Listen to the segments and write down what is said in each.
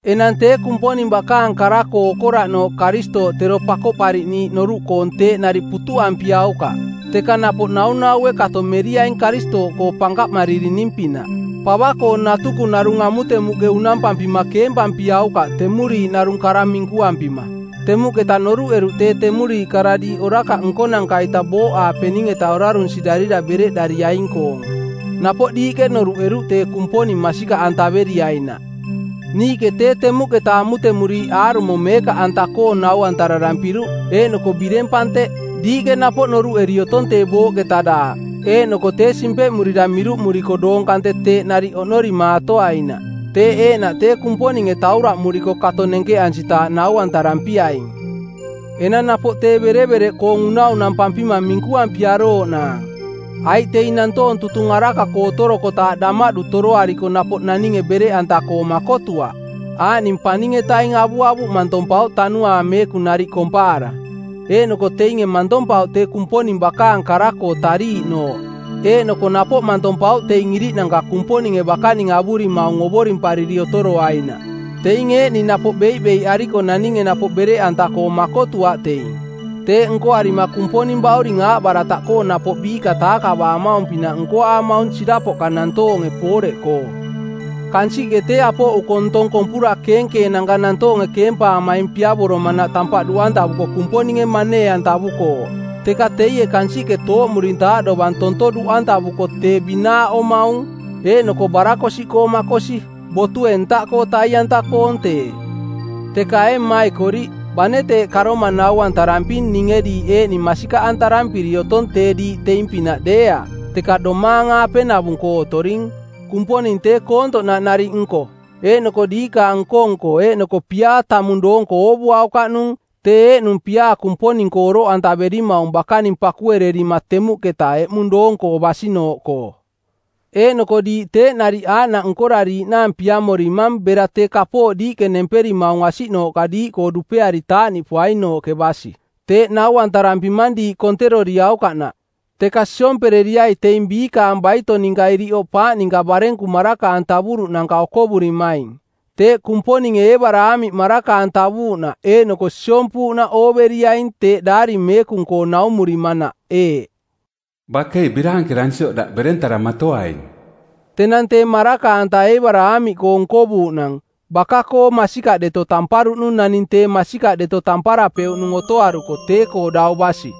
Enang tee Kumponing bakaang kara-koo okoraꞌnooꞌ Karistooꞌ tero Pakoꞌpariꞌniiꞌ noruꞌkoong teeꞌ nariꞌ putuꞌampiaukaꞌ, teka napoꞌ naunaue kato meriaing Karistooꞌkoo pankaꞌmaririning-pinaꞌ. Pava-koo natuku narung amutemuꞌke unampampima keempampiaukaꞌ temuriiꞌ narung kara minkuampima. Temuꞌketa noruꞌeruꞌ tee temuriiꞌ kara diiꞌ orakaꞌ nkonanka-ita booꞌaapening-eta orarunsirarira bereꞌdariaing-koong. Napoꞌ diiꞌke noruꞌeruꞌ tee Kumponing masikaꞌantaveriainaꞌ. Niiꞌke tee temuꞌketa amutemuriiꞌ aarumo meekaꞌanta-koong nau-antararampiruꞌ, eeꞌnoko bireng panteꞌ. Diiꞌke napoꞌ noruꞌeri otong tee booꞌketa daaꞌ eeꞌnoko tee simpeꞌmurira miruꞌmuriko doong kante teeꞌ nariꞌ oꞌnorimaatoainaꞌ. Teeꞌ eeꞌnaꞌ tee Kumponinge tauraꞌmuriko kato nenkeꞌansitaaꞌ nau-antarampiaing. Enang napoꞌ tee berevereꞌ unaunampampima minkuampiarooꞌnaang, aiꞌ teing nantoong tutung araka-koo otorokotaaꞌ damaꞌdu toroariko napoꞌ naninge bereꞌanta-koo makotuaꞌ, aaꞌning paning-etaing avuavuꞌ mantompauꞌ Tanuaang Meekung nariꞌ kompaara. Eeꞌnoko teinge mantompauꞌ tee Kumponing bakaang kara-koo tariiꞌnooꞌ eeꞌnoko napoꞌ mantompauꞌ teing iriꞌnanka Kumponinge bakaning avurimaung ovorimpariri otoroainaꞌ. Teing eeꞌning napoꞌ beiꞌbeiꞌariko naninge napoꞌ bereꞌanta-koo makotuaꞌ teing. Teeꞌ nkoarima Kumponing bauring aaꞌbarataꞌkoo napoꞌ biiꞌka taakavaamaung-pinaꞌ nkoaamaung sirapoꞌka nantoonge pooreꞌkoo. Kansiꞌke tee apoꞌuko ntong kompura keenkeenanka nantoonge keempaamaing piavoromanaꞌ tampaꞌ duꞌantavuko Kumponinge manee-antavukooꞌ. Teka teie kansiꞌke tooꞌmurintaaꞌ dovang tonto duꞌantavuko tee binaaꞌomaung, eeꞌnoko barakosiꞌkoo makosi. Botue ntaꞌkoo tai-anta-koong tee. Teka ee maikoriꞌ, bane teeꞌ karoma nau-antaramping ninge diiꞌ eeꞌning masikaꞌantarampiri otong tee diiꞌ teing-pinaꞌ deeaꞌ, teka domaang-aape-navung-koo otoring. Kumponing tee koontoꞌnaꞌ nariꞌ nko, eeꞌnoko diikaang nko-nko eeꞌnoko piaa tamung doonko oovuaukaꞌnung, tee eeꞌnung piaa Kumponing-koo oroꞌantaverimaung bakaning pakuererima temuꞌketa eꞌmung doong-koo basinooꞌkoo. Eeꞌnoko diiꞌ teeꞌ nariꞌ aaꞌnaꞌ nkorariiꞌnaang piamorimang bera tee kapooꞌ diiꞌke nemperimaung asiꞌnooꞌka diiꞌkoo dupeari taaꞌniꞌpoainooꞌke basi. Teeꞌ nau-antarampimang diiꞌ konteroriaukaꞌnaꞌ, teka siompereriai teing biikaang baito ninka iriꞌ oꞌpaaꞌ ninka barenku maraka-antavuruꞌnanka okovurimaing. Teeꞌ Kumponinge Eebaraamiꞌ maraka-antavuuꞌnaꞌ eeꞌnoko siompuuꞌnaꞌ ooveriaing teeꞌ daari meekung-koo naumurimanaꞌ eeꞌ, “Bakei biraankeransioꞌ daꞌ berentaramatoaing.” Tenang tee maraka-anta Eebaraamiꞌkoo nkovuuꞌnang, baka-koo masikaꞌ deto tamparuꞌnung naning tee masikaꞌ deto tamparapeuꞌnung otoaruko tee-koo dau basi.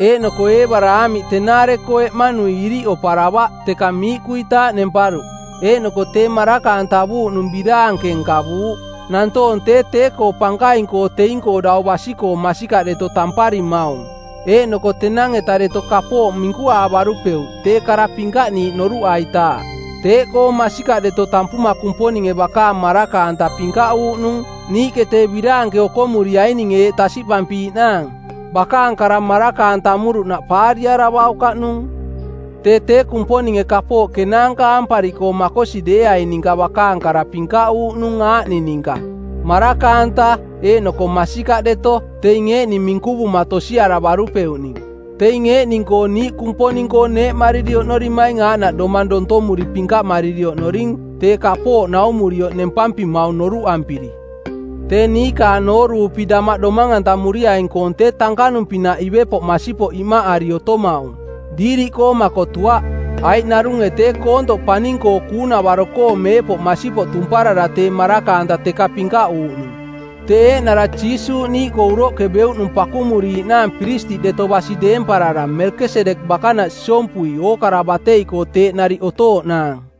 Eeꞌnoko Eebaraamiꞌ tenaare-koo eꞌmanui iriꞌ oparavaꞌ teka miiꞌkuitaaꞌ nemparuꞌ, eeꞌnoko tee maraka-antavuuꞌnung biraanke nkavuuꞌ. Nantoong tee tee-koo pankaing-koo teing-koo dau basi-koo masikaꞌ deto tamparimaung, eeꞌnoko tenang-eta deto kapooꞌ minkuaavarupeuꞌ tee kara pinkaꞌniiꞌ noruꞌaitaaꞌ. Teeꞌkoo masikaꞌ deto tampuma Kumponinge bakaang maraka-anta pinkaꞌuuꞌnung niiꞌke tee biraanke okomuriaininge eeꞌ tasiꞌpampiiꞌnaang: bakaang kara maraka-antamuruꞌnaꞌ paariaravaukaꞌnung. Tee tee Kumponinge kapooꞌ kenaanka aampariꞌkoo makosi deeaing ninka bakaang kara pinkaꞌuuꞌnung aaꞌning ninka maraka-anta eeꞌnoko masikaꞌ deto, teing eeꞌning minkuvuma tosiaravarupeuꞌning. Teing eeꞌning-koo niiꞌ Kumponing-koo neeꞌmariri oꞌnorimaing aaꞌnaꞌ domang dontomuri pinkaꞌmariri oꞌnoring tee kapooꞌ naumurioꞌ nempampimaung noruꞌampiri. Tee niikaang nooruupi damaꞌ domang-antamuriaing-koong tee tankanung-pinaꞌ ivepoꞌ masipoꞌ iꞌmaꞌari otomaung, diiriꞌkoo makotuaꞌ, aiꞌ narunge tee koontoꞌ paning-koo kuunavaro-koo meepoꞌ masipoꞌ tumparara tee maraka-anta teka pinkaꞌuuꞌnung; Tee eeꞌnara Jiisuuꞌ niiꞌkoo uroꞌke beuꞌnung pakumuriiꞌnaang piristiꞌ deto basi deemparara Melkesedek bakanaꞌ siompui ookara batei-koo teeꞌ nariꞌ otooꞌnaang.